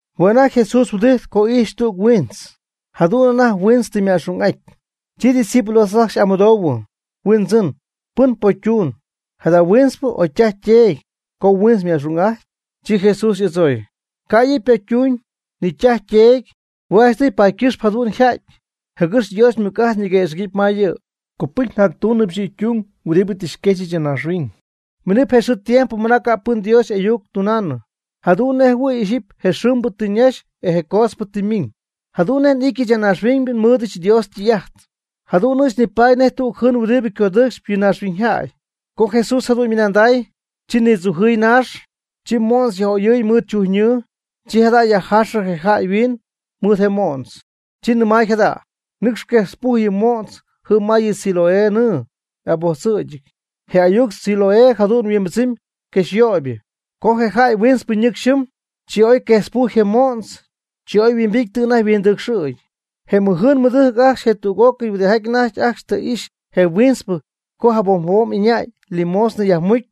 Hue' anajty Jesús huɨdijtp co ijxy tüg huintz, jadu'n anajty huiintz tɨ yma'xung'aty. Chi ydiscípulos ajcxy y'amɨdoohuɨ: ―Huindzɨn, ¿pɨn pocy ytuun, jada huintzpɨ o ytaj yteedy, co huintz yma'xung'atyɨ? Chi Jesús y'adzooy: ―Ca' yɨ' ypocytuuñ, ni ytaj yteedy, hue' janchtɨy paady ycɨxp jadu'n yjajty, jɨgɨx Dios ymɨc'ajt ñiguëxɨ̈gɨty ma yɨ'. Copɨcy njactúunɨbɨch yɨ' ytung huɨdibɨ tɨ xyquexyɨch ya naaxhuiñ. Miinɨp je xɨɨ tiempo ma ca' pɨn Dios y'ayuc tunaanɨ. Jadu'n nej jɨhuɨ̈y ixyipy je xɨɨmbɨ tɨ ñaxy etz je coodzpɨ tɨ ymiiñ. Jadu'n nej n'ityɨch ya naaxhuiñ nmɨɨdɨch Dios ytɨy'ajt, jadu'n ɨɨch nipaady nej tüg jɨɨn huɨdibɨ codɨɨcxp yɨ naaxhuiñyjäy. Co Jesús jadu'n ymɨnanday, chi nidzujɨɨy naax, chi mo'ntz yaj'oyɨɨy mɨɨd chujnɨɨ, chi jada' yajjaaxɨ je jäy yhuiin mɨɨd je mo'ntz. Chi nɨmay jada': ―Nɨcx quejtzpuj yɨ mo'ntz jɨm ma yɨ Siloé nɨɨ y'abojtzɨ̈gɨty ―je ayuc Siloé jadu'n yhuimbɨdzɨmy: quexyöybɨ. Chi je jäy huintzpɨ ñɨcxy jɨm, chi oy quejtz pujy je mo'ntz, chi oy huimbity tɨ anajty yhuindɨcxɨ̈gy. Je ymɨjɨɨn ymɨdɨjc ajcxy etz tüg'ócɨy huɨdijaty anajty ajcxy tɨ ixy je huintzpɨ co jabom jabom ɨñäy limosna yajmucy,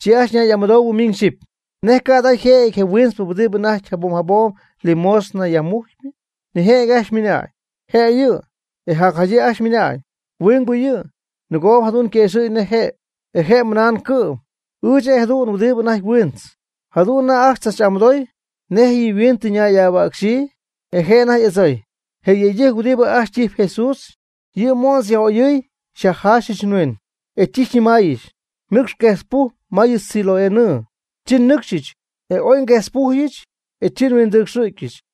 chi ajcxy ñay'amɨdoohuɨ miñ xyɨpy: ―¿Nej ca' jada yjëjɨty je huintzpɨ huɨdibɨ anajty jabom jabom limosna yajmujcpɨ? Nijëjɨty ajcxy ymɨnañ: ―Je' yɨ'. E jacjadyii ajcxy ymɨnañ: ―Huingbɨ yɨ', nɨgoob jadu'n yquëxɨ̈gy nej je'. E je' ymɨnañ cɨ'm: ―Ɨɨch jëdu'n huɨdibɨ anajty huintz. Jadu'n anajty ajcxy tzach'amɨdoy: ―¿Nej yɨ mhuiin tɨ ñay'ahuäcxyii? E je' anajty y'adzooy: ―Yɨ yëydɨjc huɨdibɨ ajcxy ytijyp Jesús, yɨ' mo'ntz yaj'oyɨɨy xyajjaaxɨch nhuiin, e chi xyñɨmaayɨch: “Nɨcx quejtzpuj ma yɨ Siloé nɨɨ.” Chi nnɨcxyɨch, e oy nguejtzpujyɨch, e chi nhuindɨcxɨ'cyɨch.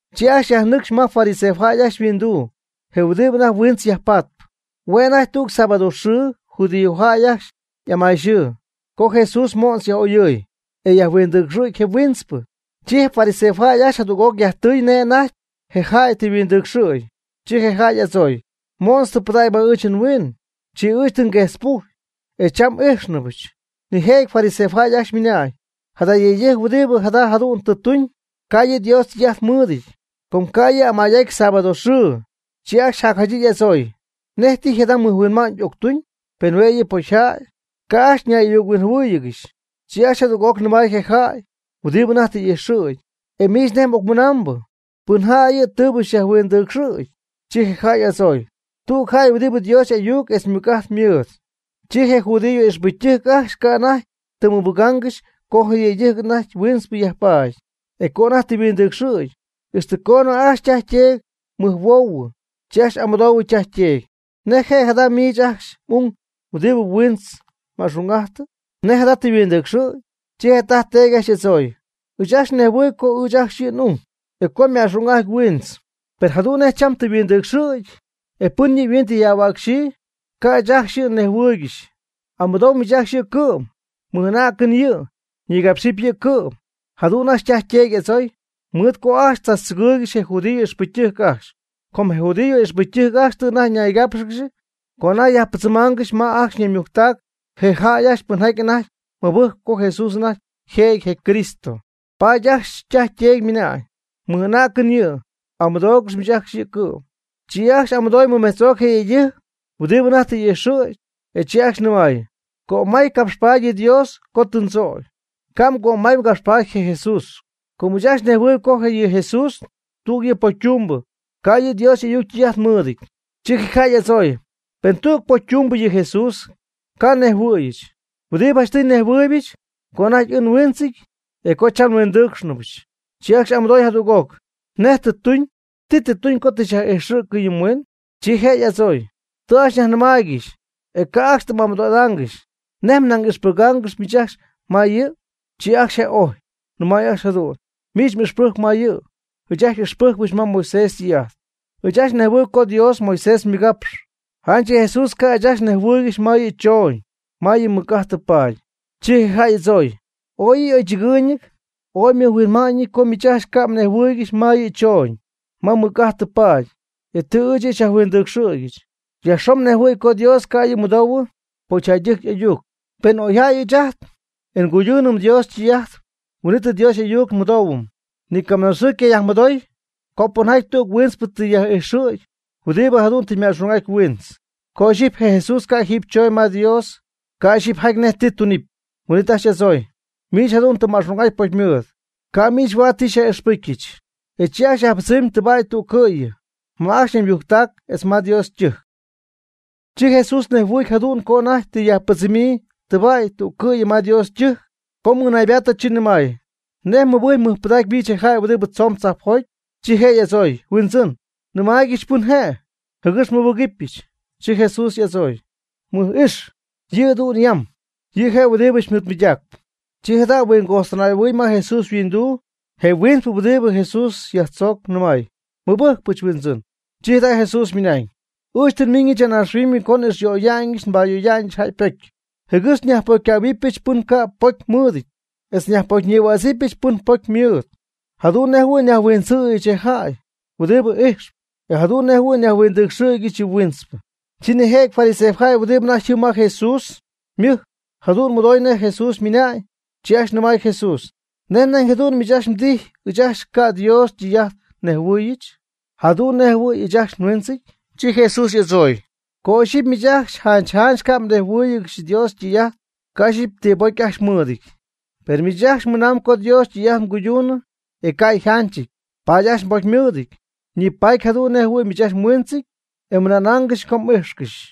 Chi ajcxy yajnɨcxy ma fariseojäy ajcxy yhuinduu, je huɨdibɨ anajty huintz yajpatp. Hue' anajty tüg sábado xɨɨ (judíojäy ajcxy amayxɨɨ) co Jesús mo'ntz yaj'oyɨɨy, e yajhuindɨcxɨ̈gy je huintzpɨ. Chi je fariseojäy ajcxy jadüg'oc yajtɨy nej anajty je jäy tɨ yhuindɨcxɨ̈gy. Chi je jäy y'adzooy: ―Mo'ntz tɨ pɨdägy ma ɨɨch nhuiin, chi ɨɨch tɨ nguejtzpujy, e cham n'ijxnɨbɨch. Nijëjɨty fariseojäy ajcxy ymɨnañ: ―Yɨ yëydɨjc huɨdibɨ jada jadu'n tɨ tuñ, ca' yɨ' Dios ytɨy'ajt mɨɨdɨty, com ca' yɨ' amay'aty sábado xɨɨ. Chi ajcxy jacjadyii y'adzooy: ―¿Nej tijy jada mɨjhuinma'ñ octuñ, pen hue' yɨ' pocyjäy? Ca' ajcxy nay'ayuc-huinjɨhuɨ́ɨyɨgɨxy. Chi ajcxy jadüg'oc nɨmay je jäy huɨdibɨ anajty tɨ y'ijxɨ̈gy: ―E miich, ¿nej m'ocmɨnambɨ? ¿Pɨn jäy yɨ tɨɨbɨ xyajhuindɨcxɨ̈gy? Chi je jäy y'adzooy: ―Tüg jäy huɨdibɨ Dios y'ayuc etz ymɨc'ajt mɨɨd. Chi je judío ixpɨcytɨjc ajcxy ca' anajty tɨm mɨbɨgaangɨxy co je yëydɨjc anajty huintz yajpaady, e co anajty tɨ yhuindɨcxɨ̈gy, ixtɨ coonɨ ajcxy ytaj yteedy mɨjhuoohuɨ. Chi ajcxy amɨdoohuɨ ytaj yteedy: ―¿Nej je' jada miich ajcxy m'ung huɨdibɨ huintz ma'xung'ajtɨ? ¿Nej jada tɨ yhuindɨcxɨ̈gy? Chi je' ytaj yteedy ajcxy y'adzooy: ―Ɨɨch ajcxy nnejhuɨɨyb co ɨɨch ajcxy yɨ' n'ung, e co yma'xung'ajty huiintz. Per jadu'n nej cham tɨ yhuindɨcxɨ̈gy, e pɨn yɨ' yhuiin tɨ yajhuäcxyii, ca' ɨɨch ajcxy yɨ' nnejhuɨɨygɨxy. Amɨdoo miich ajcxy yɨ' cɨ'm. Mɨj'anäcɨñ yɨ', ñigapxɨpy yɨ' cɨ'm. Jadu'n ajcxy ytaj yteedy y'adzooy, mɨɨd co ajcxy tzachtzɨgɨɨygɨxy je judío ixpɨcytɨjc ajcxy. Com je judío ixpɨcytɨjc ajcxy tɨ anajty ñaygápxɨgɨxy co anajty yajpɨdzɨmaangɨxy ma ajcxy ñaymujctac je jäy ajcxy pɨnjaty anajty mɨbɨjcp co Jesús anajty yjëjɨty je Cristo. Paady ajcxy ytaj yteedy ymɨnañ: ―Mɨj'anäcɨñ yɨ', amɨdoogɨx miich ajcxy yɨ' cɨ'm. Chi ajcxy y'amɨdooy mɨmejtz'oc je yëydɨjc huɨdibɨ anajty tɨ y'ijxɨ̈gy, e chi ajcxy nɨmay: ―Cömay capxpat yɨ Dios co tɨ mdzögy. Ca' mgömay mgapxpaady je Jesús. Com ɨɨch ajcxy nejhuɨɨyb co yɨ Jesús, tüg yɨ' pocytumbɨ. Ca' yɨ' Dios y'ayuc ytɨy'ajt mɨɨdɨty. Chi je jäy y'adzooy: ―Pen tüg pocytumbɨ yɨ Jesús, ca' nejhuɨ̈yɨch. Huɨdibɨ janchtɨy nnejhuɨɨybɨch, co anajty ɨɨch nhuintzɨty etz co cham huindɨ́cxnɨbɨch. Chi ajcxy y'amɨdooy jadüg'oc: ―¿Nej tɨ xytuñ? ¿Ti tɨ tuñ co tɨ xyaj'ijxɨ̈cɨ yɨ mhuiin? Chi je' y'adzooy: ―Tɨ ajcxy nyajnɨmaaygɨxy, e ca' ajcxy tɨ m'amɨdo'idaangɨxy. ¿Nej nañ ixpɨgaangɨxy miich ajcxy ma yɨ'jɨ? Chi ajcxy je' ojy, nɨmay ajcxy jadu'n: ―Miich ixpɨjc ma yɨ', ɨɨch ajcxy n'ixpɨjcpɨch ma Moisés ytɨy'ajt. Ɨɨch ajcxy nejhuɨɨyb co Dios Moisés mɨgapxy. Janch yɨ Jesús ca' ɨɨch ajcxy nnejhuɨɨygɨxy ma yɨ' chooñ (ma mɨc'ajt tɨ paady). Chi je jäy y'adzooy: ―Ooy yɨ' y'oychɨgɨɨyñɨty y'oyhuinma'ñɨty co miich ajcxy ca' mnejhuɨɨygɨxy ma yɨ' chooñ (ma mɨc'ajt tɨ paady), e tɨ ɨɨch yɨ' xyajhuindɨcxɨ̈gyɨch. Yajxon yajnejhuɨ̈y co Dios ca' yɨ' mɨdoohuɨ pocyjäydɨjc y'ayuc. Pen oy jäy ɨɨch ajt, e nguyduunɨm Dios ytɨy'ajt, huin'it ajt Dios n'ayuc xymɨdoohuɨm. Ni camɨnaaxɨɨ ycayajmɨdoy, co pɨnjäy tüg huintzpɨ tɨ yaj'ijxɨ̈gy huɨdibɨ jadu'n tɨ yma'xung'aty huintz. Co ixyipy je Jesús ca' jiiby chooñ ma Dios, ca' ixyipy jaty nej ti tunɨpy. Huin'it ajcxy y'adzooy: ―Miich jadu'n tɨ mma'xung'aty pocymɨɨd. Ca' miich huaad ti xyaj'ixpɨ́jccɨxyɨch. E chi ajcxy yajpɨdzɨmy tɨbäy'tüccɨ'yɨ (ma ajcxy ñaymujctac etz ma Dios ytɨjc). Chi Jesús nejhuɨy jadu'n co anajty tɨ yajpɨdzɨmy tɨba'y tüccɨ'yɨ ma Dios ytɨjc. Co mɨnaaybaatɨ chi nɨmay: ―¿Nej mmɨbɨjcyp mɨjpɨdaacyp miich je jäy huɨdibɨ tzoon tzajpjoty? Chi je' y'adzooy: ―Huindzɨn, nɨmaaygɨch pɨn je', jɨgɨx nmɨbɨcyɨch. Chi Jesús je' y'adzooy: ―M'ijxyp yɨ'du'n yam. Yɨ je' je huɨdibɨ xymɨɨdmɨydacp. Chi jada' huingoxtɨnay'ahuɨy ma Jesús yhuinduu, je huintzpɨ huɨdibɨ Jesús tɨ yajtzögy nɨmay: ―Nmɨbɨjcypɨch, huindzɨn. Chi jada' Jesús ymɨnañ: ―Ɨɨch tɨ nmiñ ya naaxhuiñ co n'ixyöyaanɨch nbayöyaanɨch jäy ypocy, jɨgɨx nyajpocycähuɨbɨch pɨn ca' ypocymɨɨdɨty, etz nyajpocyñïhuädzɨbɨch pɨn ypocy mɨɨd. Jadu'n nej jɨhuɨ̈y nyajhuindzɨ̈yɨch je jäy huɨdibɨ ijxp, etz jadu'n nej jɨhuɨ̈y nyajhuindɨcxɨ̈gyɨch yɨ huintzpɨ. Chi nijëjɨty fariseojäy huɨdibɨ anajty jɨm ma Jesús ymɨjc jadu'n mɨdoy nej Jesús ymɨnañ, chi ajcxy nɨmay Jesús: ―¿Nej nañ jadu'n miich mdijy ɨɨch ajcxy ca' Dios ytɨy'ajt nejhuɨɨyɨch, jadu'n nej jɨhuɨ̈y ɨɨch ajcxy nhuintzɨty? Chi Jesús y'adzooy: ―Co ixyipy miich ajcxy janch janch ca' mnejhuɨɨygɨxy Dios ytɨy'ajt, ca' ixyipy ti pocy ajcxy mmɨɨdɨty. Per miich ajcxy mɨnam co Dios ytɨy'ajt mguyduunɨy, e ca' yjanchɨty. Paady ajcxy mbocymɨɨdɨty. Nipaatyp jadu'n nej jɨhuɨ̈y miich ajcxy mhuintzɨty, e mmɨnaangɨxy co m'ijxcɨxy.